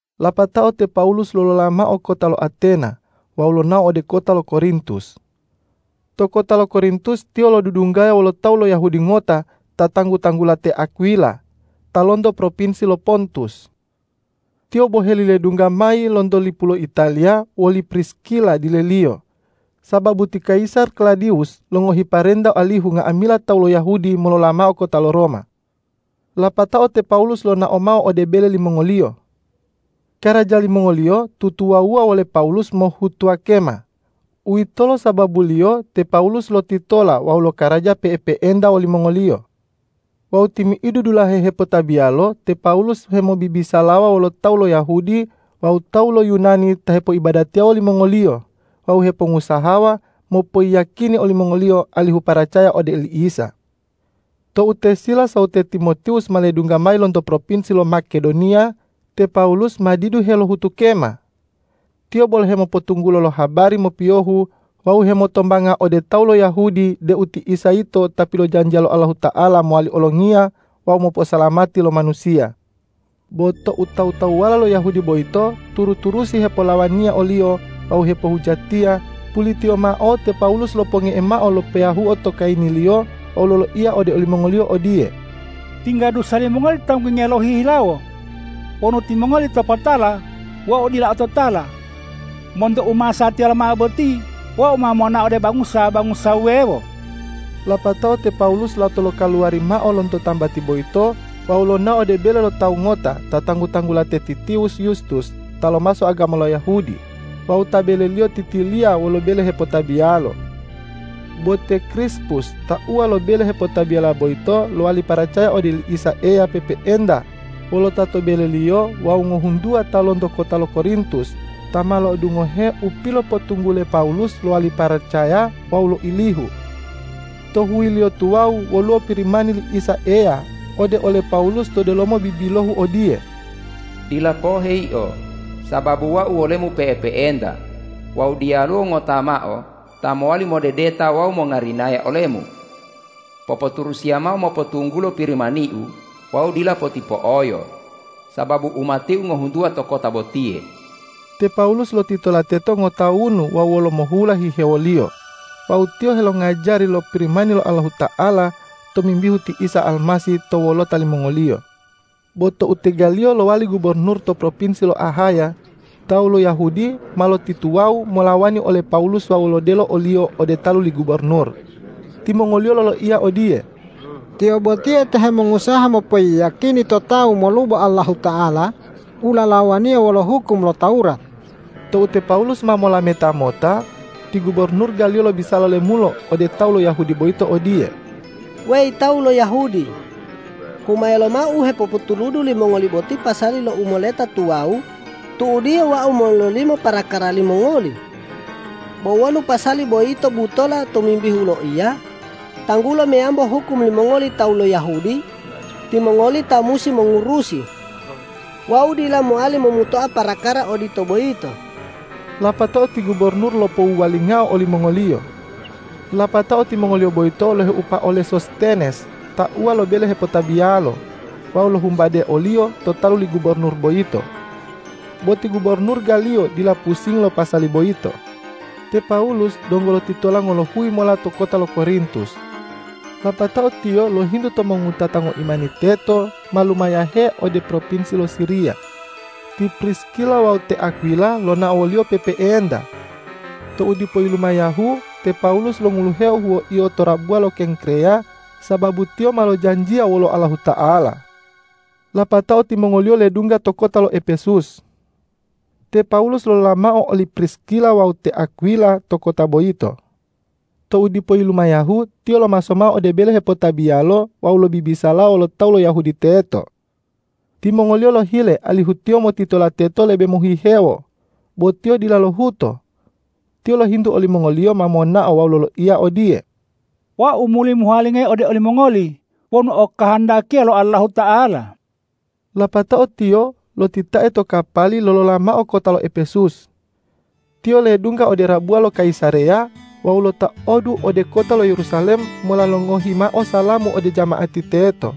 Lapatao te Pawulus lolola mao kota lo Atena wawu lonao ode kota lo Korintus. To kota lo Korintus tiyo lodudunggaya wolo tawu lo Yahudi ngota ta tanggu-tanggula te Akwila ta lonto propinsi lo Pontus. Tiyo boheli ledungga mayi lonto lipu lo Italiya woli Priskila dileliyo, sababu ti kayisar Klawudiwus longohi parenta alihu nga'amila tawu lo Yahudi molola mao kota lo Roma. Lapatao te Pawulus lonao mao ode bele limongoliyo. Karaja limongoliyo tutuwawuwa wole Pawulus mohhutuwa kema. Uwitolo sababuliyo te Pawulus lotitola wawu lokaraja pe'epe'enta wolimongoliyo. Wawu timi'idu dulahe hepotabiyalo te Pawulus hemobibisalawa wolo tawu lo Yahudi wawu tawu lo Yunani ta hepoibadatiya wolimongoliyo wawu hemongusaha mopoyiyakini olimongoliyo alihu paracaya ode oli Isa. Tou te Silas wawu te Timotiwus ma ledungga mayi lonto propinsi lo Makedoniya, te Pawulus ma didu helohutu kema. Tiyo bolo hemopotunggulo habari mopiyohu wawu hemotombanga ode tawu lo Yahudi deu ti Isa yito Ta pilojanjiya lo Allahuta'ala mowali Olongiya wawu moposalamati lo manusiya. Bo tou tawu-tawuwala lo Yahudi boyito turu-turusi hepolawaniya oliyo wawu hepohujatiya, pulitiyo mao te Pawulus loponge'e mao lo peyahuo to kayiniliyo wawu loloiya ode olimongoliyo odiye,”Tingga dusa limongoli tanggungiya lohihilawo. Wonu timongoli topotala, wau dila ototala. Monto u masatiya lomao boti wau ma monao ode bangusa-bangusa wuwewo.” Lapatao te Pawulus lato lokaluwari mao lonto tambati boyito wawu lonao ode bele lo tawu ngota ta tanggu-tanggula te Titiwus Yustus ta lomaso agama lo Yahudi wawu ta beleliyo titiliya wolo bele hepotabiyalo. Bo te Krispus tauwa lo bele hepotabiyala boyito lowali paracaya ode oli Isa Eya pe'epe'enta wolo ta to beleliyo wawu ngohuntuwa ta lonto kota lo Korintus, ta ma lo'odungohe u pilopotunggule Pawulus lowali paracaya wawu loilihu. To huyiliyo tuwawu woluwo Pirimani li Isa Eya ode ole Pawulus to delomo bibilohu odiye,”Dila pohe yio, sababu Wau wolemu pe'epe'enta wawu diyaluwo ngota mao ta mowali modedeta wawu mongarinaya olemu. Popoturusiya mao mopotunggulo Pirimani-U wawu dila potipo'oyo, sababu umati-U ngohuntuwa to kota botiye.” Te Pawulus lotitola teto ngotawunu wawu wolomohula hihewoliyo wawu tiyo helongajari lo Pirimani lo Allahuta'ala tomimbihu ti Isa Almasih to wolota limongoliyo. Bo tou te Galiyo lowali gubornur to propinsi lo Ahaya, tawu lo Yahudi ma lotituwawu molawani ole Pawulus wawu lodelo oliyo ode talu li gubornur. Timongoliyo loloiya odiye,”Tiyo botiye ta hemongusaha mopoyiyakini to tawu molubo Allahuta'ala u lalawaniya wolo hukum lo Tawurat.” Tou te Pawulus ma molameta mota, ti gubornur Galiyo lobisala lemulo ode tawu lo Yahudi boyito odiye,”Weyi tawu lo Yahudi! Humaya lomao u hepopotuludu limongoli boti pasali lo u moleta tuwawu, tu'udiyo wau mololimo parakara limongoli. Bo wonu pasali boyito butola tomimbihu loiya, tanggulo meyambo hukum limongoli tawu lo Yahudi, timongoli ta musi mongurusi. Wau dila mowali momutoa parakara odito boyito!” Lapatao ti gubornur lopowuwalingao olimongoliyo. Lapatao timongoliyo boyito loheupa ole Sostenes tauwa lo bele hepotabiyalo, wawu lohumbade oliyo to talu li gubornur boyito. Bo ti gubornur Galiyo dila pusingi lo pasali boyito. Te Pawulus donggo lotitola ngolohuyi mola to kota lo Korintus. Lapatao tiyo lohintu to mongowutata ngoimani teto ma lumayahe ode propinsi lo Siriya. Ti Priskila wawu te Akwila lonao woliyo pe'epe'enta. Tou dipo yilumayahu, te Pawulus longuluheo huwoiyo to rabuwa lo Kengkreya, sababu tiyo ma lojanjiya wolo Allahuta'ala. Lapatao timongoliyo ledungga to kota lo Epesus. Te Pawulus lolola mao oli Priskila wawu te Akwila to kota boyito. Tou dipo yilumayahu, tiyo lomaso mao ode bele hepotabiyalo wawu lobibisalawa wolo tawu lo Yahudi teto. Timongoliyo lohile alihu tiyo motitola teto lebe mohihewo, bo tiyo dila lohuto. Tiyo lohintu olimongoliyo ma monao wawu loloiya odiye,”Wau muli mohuwalingayi ode olimongoli wonu okahandakiya lo Allahuta'ala.” Lapatao tiyo lotitae to kapali lolola mao kota lo Epesus. Tiyo ledungga ode rabuwa lo Kayisareya wawu lotaodu ode kota lo Yerusalem mola longohi mao salamu ode jama'ati teto.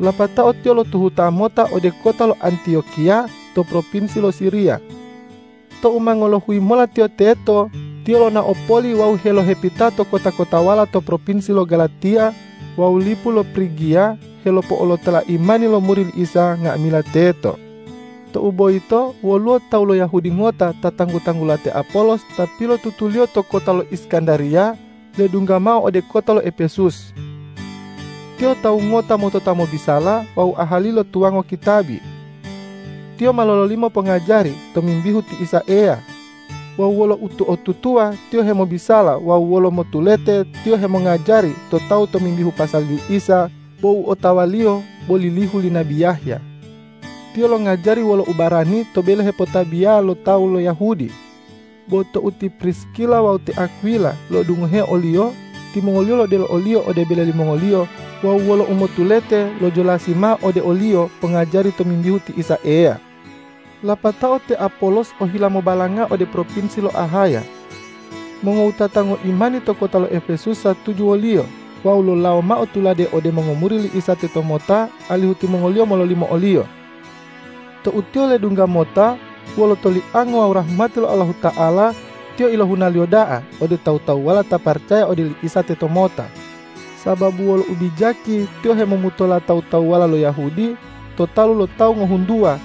Lapatao tiyo lotuhuta mota ode kota lo Antiyokiya to propinsi lo Siriya. Tou ma ngolohuyi mola tiyo teto, tiyo lonao poli wawu helohepita to kota-kotawala to propinsi lo Galatiya wawu lipu lo Prigiya helopo'olotola imani lo muri li Isa nga'amila teto. Tou boyito woluwo tawu lo Yahudi ngota ta tanggu-tanggula te Apolos ta pilotutuliyo to kota lo Iskandariya ledungga mao ode kota lo Epesus. Tiyo tawu ngota motota mobisala wawu ahali lo tuwango kitabi. Tiyo ma lololimo pongajari tomimbihu ti Isa Eya. Wawu wolo uto'otutuwa tiyo hemobisala wawu wolo motulete tiyo hemongajari to tawu tomimbihu pasali li Isa, bo u otawaliyo bo lilihu li nabi Yahya. Tiyo longajari wolo ubarani to bele hepotabiya lo tawu lo Yahudi. Bo tou ti Priskila wawu te Akwila lo'odungoheo oliyo, timongoliyo lodelo oliyo ode bele limongoliyo wawu wolo umotulete lojolasi mao ode oliyo pongajari tomimbihu ti Isa Eya. Lapatao te Apolos ohila mobalanga ode propinsi lo Ahaya. Mongowutata ngoimani to kota lo Epesus satuju woliyo wawu lolawo mao tuladu ode mongomuri li Isa tetomota, alihu timongoliyo mololimo oliyo. Tou tiyo ledungga mota, wolo toliango wawu rahmati lo Allahuta'ala tiyo ilohunaliyo da'a ode tawu-tawuwala ta paracaya ode oli Isa tetomota, sababu wolo ubijaki tiyo hemomutola tawu-tawuwala lo Yahudi to talu lo tawu ngohuntuwa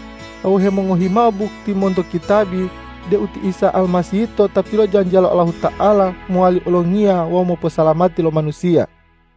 wawu hemongohi mao bukti monto kitabi deu ti Isa Almasih yito Ta pilojanjiya lo Allahuta'ala mowali Olongiya wawu moposalamati lo manusiya.